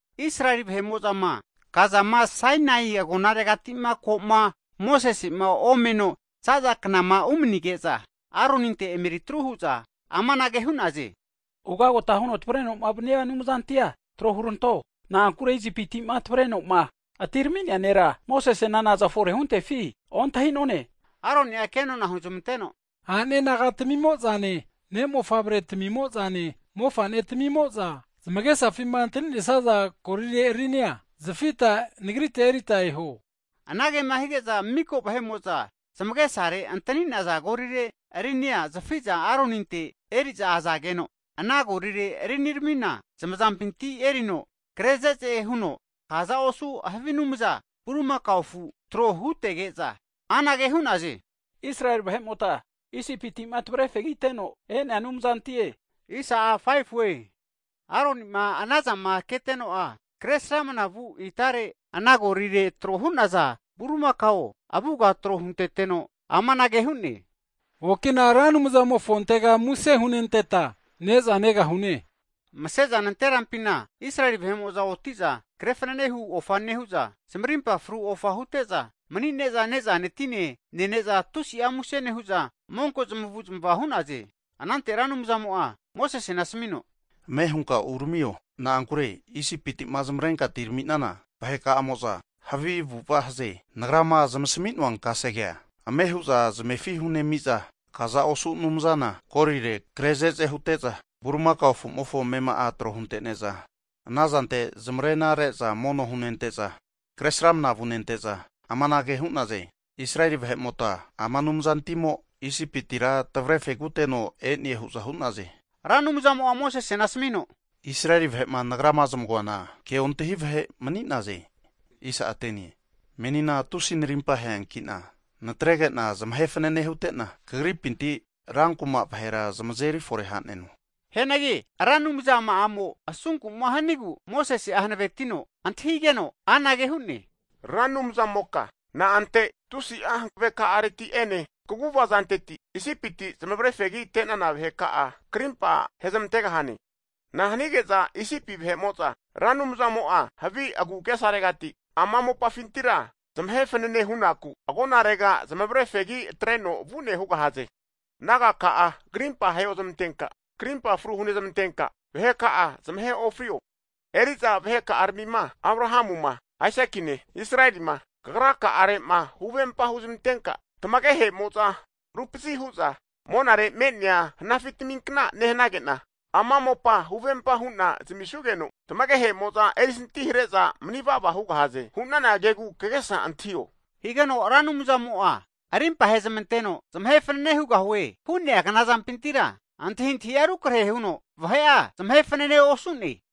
Israeli vahe'mo'zama kazama Sainai agonaregati'ma koma Mosese'ma omeno za'za knama umanige'za, Aroninte emeri atru hu'za amanage hu'naze, ugota huno tavreno'ma vania anumzantia tro huranto. Na'ankure Isipiti'ma tavreno'ma atirami'nea nera Mosesena naza fore huntefi ontahune. Aroni'a kenona huzmanteno, a'ne nagatamimo'zane ne' mofavretamimo'zane mofa'netamimo'za zamagesafima antani'nesaza golire rinia zafita nagrite erita eho. Anagema hige'za mika vahe'mo'za zamagesare antani'naza golire rinia zafi'za Aroninte eri'za azageno, ana golire riniramina zamazampinti erino kre ze'ze huno kaza osu havi anumza bulimakao afu tro hutege'za, anage hu'naze, Israeli vahe'mota Isipiti'ma tavre fegiteno e'nea anumzantie hu'naze. Aroni'ma anazama keteno'a, Kresramana vu itare ana golire tro hu'naza bulimakao avuga tro hunteteno amanage hu'ne, okina Ra Anumzamofontega muse hunenteta ne'za negahune. Mase'za nanterampina Israeli vahe'mo'za oti'za kre fanane hu ofa nehu'za, zamarimpa fru ofa hute'za, mani'za ne'zane tine nene'za tusia muse nehu'za, monko zamavu'zmava hu'naze. Anante Ra Anumzamo'a Mosesena asamino, Ame hunka uramio, na'ankure Isipiti'ma zamavare atirami'nana vaheka'amo'za havi avu'ava haze. Nagrama zamasami'noa kasegea ame hu'za zamefi hunemi'za, kaza osu anumzana golire kre ze'ze hute'za bulimakao afu'mofo amema'a tro huntene'za, ana zante zamarena re'za mono hunente'za Kresramana vunente'za amanage hu'naze, Israeli vahe'mota ama anumzantimo Isipitira tamavre fegiteno e'ne hu'za hu'naze. Ra Anumzamo'a Mosesena asamino, Israeli vahe'ma Nagrama zamagoana ke'ontahi vahe mani'naze. Menina tusi narimpa aheanki'na natrege'na zamahe fanene hute'na, kagripinti rankuma vahera azeri fore ha'neno. Hianagi Ra Anumzama'amo asunku'ma hanigu Mosese'a hanavetino antahigeno anage hu'ne, Ra Anumzamoka na'ante tusi'a hanaveka'areti ene kaguvazanteti Isipiti zamavare fegi atre'nana vaheka'a krimpa hezamantegahane? Na'a hanige'za Isipi vahe'mo'za Ra Anumzamo'a havi agu'agesaregati ama mopafintira zamahe fanene hu'naku agonarega zamavare fegi atreno vu'ne hugahaze? Nagaka'a krimpa heozmantenka, krimpa fru hunezmantenka vaheka'a zamahe ofrio. Eri'za vaheka'aramima Abrahamuma, Aisakine, Israelima (Jekopu) Kagraka'are'ma huvempa huzmantenka, tamagehe'mo'za rupazi hu'za monare me'nea hanafitaminkna nehanage'na, ama mopa huvempa hu'na zamisuge'za tamagehe'mo'za erisanti hare'za manivava hugahaze hu'nana kegu kagesa antahio. Higeno Ra Anumzamo'a rimpa ahezmanteno zamahe fanane hugahue hu'nea knazampintira antahintahi'a rukrahe huno vahe'a zamahe fanane osu'ne.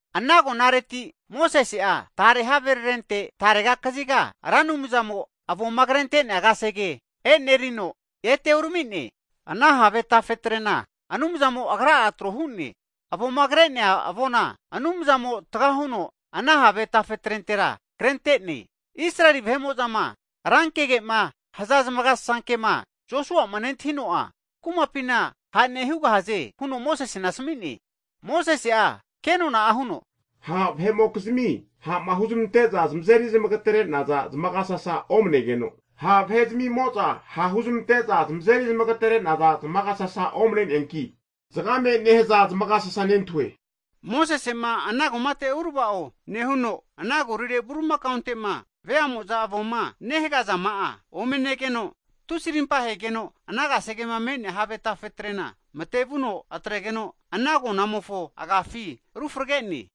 Ana agonareti Mosese'a tare haverarente tarega kaziga Ra Anumzamo avoma krente'nea kasege e'nerino ete urami'ne. Ana have tafetrena Anumzamo Agra'a trohu'ne. Avoma kre'nea avona Anumzamo tagahuno ana have tafetrentera krente'ne. Israeli vahe'mo'zama rankegema haza zamagasasa kema Joshua'ma nentahino'a, kumapina ha' nehugahaze huno Mosesena asami'ne. Mosese'a ke nona huno, Ha' vahe'mokizmi ha'ma huzmante'za zamazeri zmagatere'naza zmagasasa omane'ge no, ha' vahezmi'mo'za ha' huzmante'za zamazeri zmagatere'naza zamagasasa omane'neanki zagame nehaza zamagasasa nentahue. Mosese'ma ana kumate uravao nehuno, ana golire bulimakaonte'ma vea'mozama avoma nehagazama'a ome negegeno, tusi rimpa hegeno ana kasegema me'nea have tafetrena mate'vuno atregeno ana agonamofo agafi ru frege'ne.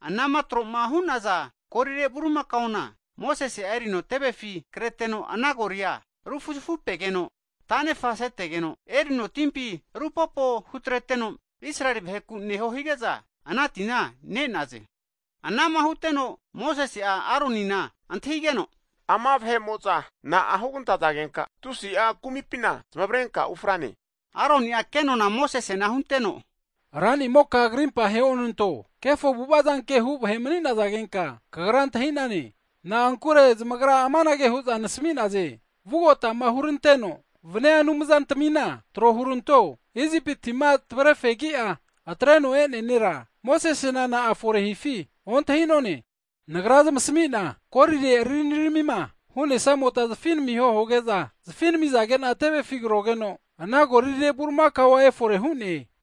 Anama tro'ma hu'naza golire bulimakaona Mosese'a erino tevefi kreteno ana goli'a ru fuzafupegeno tanefa setegeno, erino timpi rupopo hutreteno, Israeli vaheku neho hige'za, ana tina ne'naze. Anama huteno Mosese'a Aronina antahigeno, Ama vahe'mo'za na'a hugantazagenka tusi'a kumipina zamavarenka ufrane? Aroni'a kenona Mosesena hunteno, ranimoka krimpa heonanto, kefo avu'avazanke hu vahe mani'nazagenka kagra antahi'nane. Na'ankure zamagra amanage hu'za nasami'naze, vugotama huranteno vania anumzantamina tro huranto, Isipiti'ma tavre fegi'a atreno e'nea nera Mosesena na'a fore hifi ontahi'none. Nagra zamasami'na golire riniramima hu'nesamota zafinamiho huge'za zafinamizage'na tevefi krogeno, ana golire bulimakao efore hu'ne.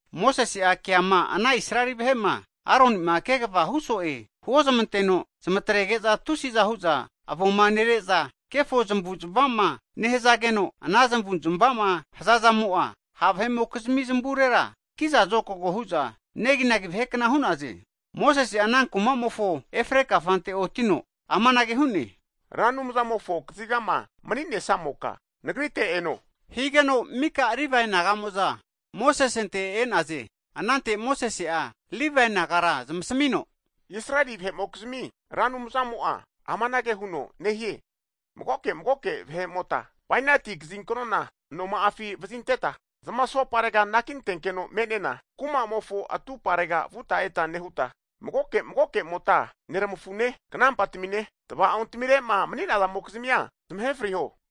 Mosese'a keama ana Israeli vahe'ma Aroni'ma kegava huso'e huozmanteno, zamatrege'za tusiza hu'za avoma nere'za kefo zamavu'zmavazama nehazageno, ana zamavu'zmavama hazazamo'a ha' vahe'mokizmi zmavurera kiza zokago hu'za neginagi vahekna hu'naze. Mosese'a ana kumamofo efre kafante otino amanage hu'ne, Ra Anumzamofo kazigama mani'nesamoka nagrite eno, higeno mika Livae naga'mo'za Mosesente e'naze. Anante Mosese'a Livae nagara zamasamino, Israeli vahe'mokizmi Ra Anumzamo'a amanage huno nehie, magoke magoke vahe'mota bainati kazinknona anoma'afi vazinteta zmasoparega anakintenkeno me'nena kumamofo atumparega vuta eta nehuta, magoke magoke'mota neramafune knampatamine, tava'ontamire'ma maninazamokizmia zamahe friho.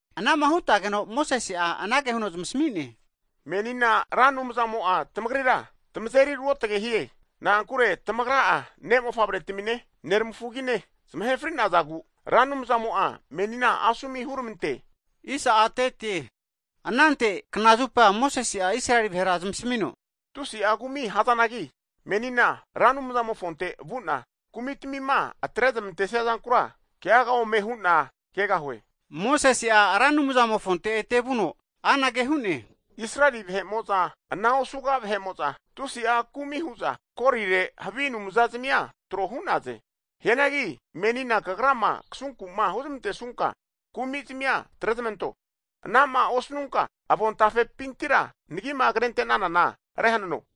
Anama hutageno Mosese'a anage huno zmasamine, menina Ra Anumzamo'a tamagrira tamazeri ruotage hie. Na'ankure tamagra'a ne' mofavretamine nermafugazmine zamahe fri'nazagu Ra Anumzamo'a menina asomu huramante. Anante knazupa Mosese'a Israeli vahera zamasmino, Tusi'a kumi hazanagi menina Ra Anumzamofonte vu'na kumitamima atrermantesia zankura keaga ome hu'na kegahue. Mosese'a Ra Anumzamofonte ete vuno anage hu'ne, Israeli vahe'mo'za ana osuga vahe'mo'za tusi'a kumi hu'za golire havi anumzazmia tro hu'naze. Hianagi menina Kagrama kasunku'ma huzmantesunka kumi'zmina atrezmanto, anama osanunka avontafepima nagima krente'nanana rehanano.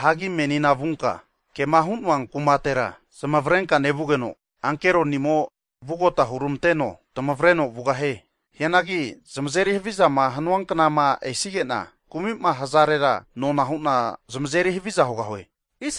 Hagi menina vunka, kema hu'noa kumatera zmavrenka nevugeno ankeronimo'a vugota hurmanteno tamavreno vugahie. Hianagi zamazeri havizama hanuanknama esige'na, kumi'ma hazarera nona hu'na zamazeri haviza hugahue.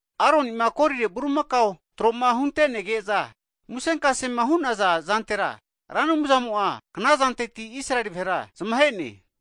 Aroni'ma golire bulimakao tro'ma hunte'nege'za musenkasema hu'naza zantera, Ra Anumzamo'a knazanteti Israeli vahera zamahe'ne.